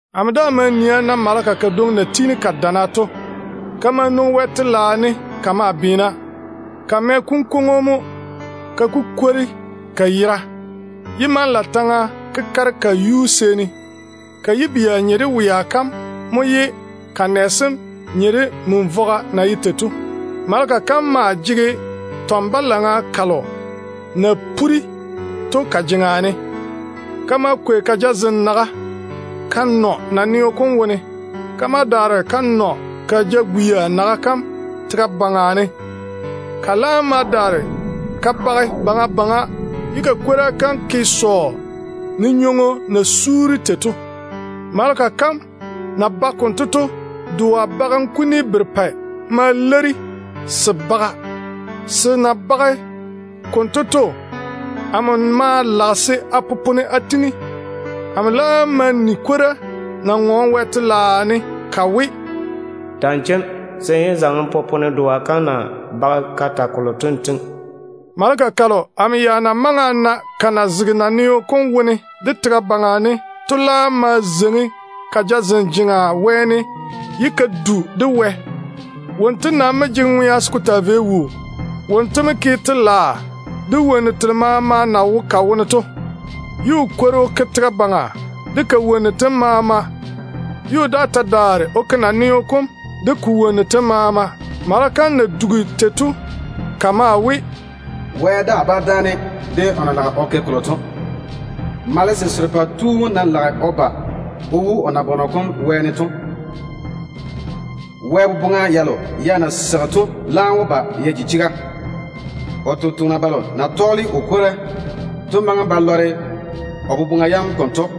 Amo daa ma nii a na maleka kadwoŋi na tiini ka dana to. Ka ma nwoŋi Wɛ telaao ne ka maa tua. Ka mɛ kunkwoŋo mo ka kukwori ka yera, ye manlaataŋa kekare ka yuu seeni. Ka yibia nye de wea kam mo, ye ka nɛ sem nye de min-vogo na ye tei to. Maleka kam maa jege tɔn-balaŋa kalo na puri to ka jeŋa ne. Ka ma kwei ka jazem naga ka chwi naneo kom wone. Ka ma daare ka chwi ka jagwia naga kam tega baŋa ne. Ka laam ma daare ka bage baŋa baŋa, ye ka kwora kam ke sɔɔ ne nywoŋo na suuri tei to. Maleka kam na bage konto to, doa bagem kuni berepɛ ma leiri-ka. Doa kam na bage konto to, amo maa lage se a popone ka kwora kam a tiŋi. Amo laam ma ni kwora na ŋɔɔne Wɛ telaao ne ka we, “Ta‑n chem, se n yé zaŋe n popone doa kam na bage ka ta kolo to n tiŋi.” Maleka kalo amo ya na maŋe a na ka na zege naneo kom wone de tega baŋa ne to laam ma zeiŋi ka jazem jeŋa wɛɛne, ye ka du Wɛ yere ŋwaane. Wonto nam mo jege ŋwea se ko taa vei wuu. O ke wɛyuu baŋa kam mo de wonnu telo maama na wo ka wone to, ye o kwori o ke tega baŋa kam de ka wonnu tem maama, O ta mo ke naneo kom, de wonnu telo maama na wo ko wone to. Maleka kam na dugi tei to, ka maa we, “Wɛ daa bá dáane de o na lage o ke kolo to. Malese serepɛ tu wom ná lage o ba o wu o nabɔnɔ kom wɛɛne to, Wɛ boboŋa yalo ya na seigi to laam wó ba ya ke ya ti. O sampwori selo déem na tɔɔle o kwora to maŋe ba lɔre o boboŋa yam konto.”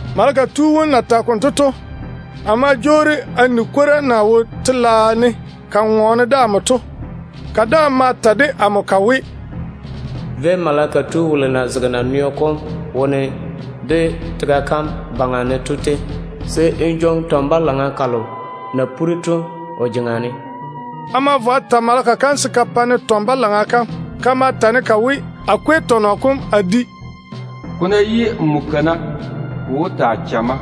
Maleka tu wom na tage konto to, amo ma jwoori a ni kwora kalo na wo telaao ne ka ŋɔɔne to. Ka daa ma ta de amo ka we, “Véi maleka tu wolo na zege naneo kom baŋa ne de tega kam baŋa ne to tei, se n jwoŋi tɔn-balaŋa kalo na puri ka wo o jeŋa ne to.” A ma vo a ta maleka kam se ka pa-ne tɔn-balaŋa kam. Ka ma ta-ne ka we, “Jwoŋi tɔnɔ kom n kwei n di. Ko ná yi nmo kana, ko wó taa chamma.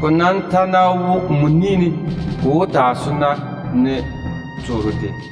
Ko nam ta ná wo nmo ni ne, ko wó taa sona ne tooro tei.”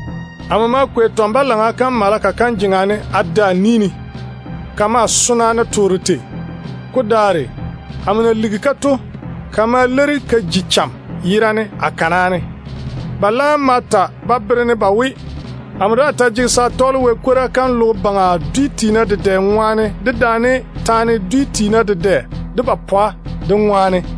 Amo ma kwei tɔn-balaŋa kam maleka kam jeŋa ne a de a ni ne. Ka maa sona ne tooro tei. Ko daare, amo na ligi-ka to, ka ma leiri ka ji cham yerane a kana ne. Ba laam ma ta ba bere-ne ba we, amo daa taa jege se a tɔɔle Wɛ kwora kam se ko vo logo baŋa dwi tiina dedɛ seeni, de teene dedɛ seeni, dedaane taana dwi dwi tiina dedɛ de ba pwa de seeni.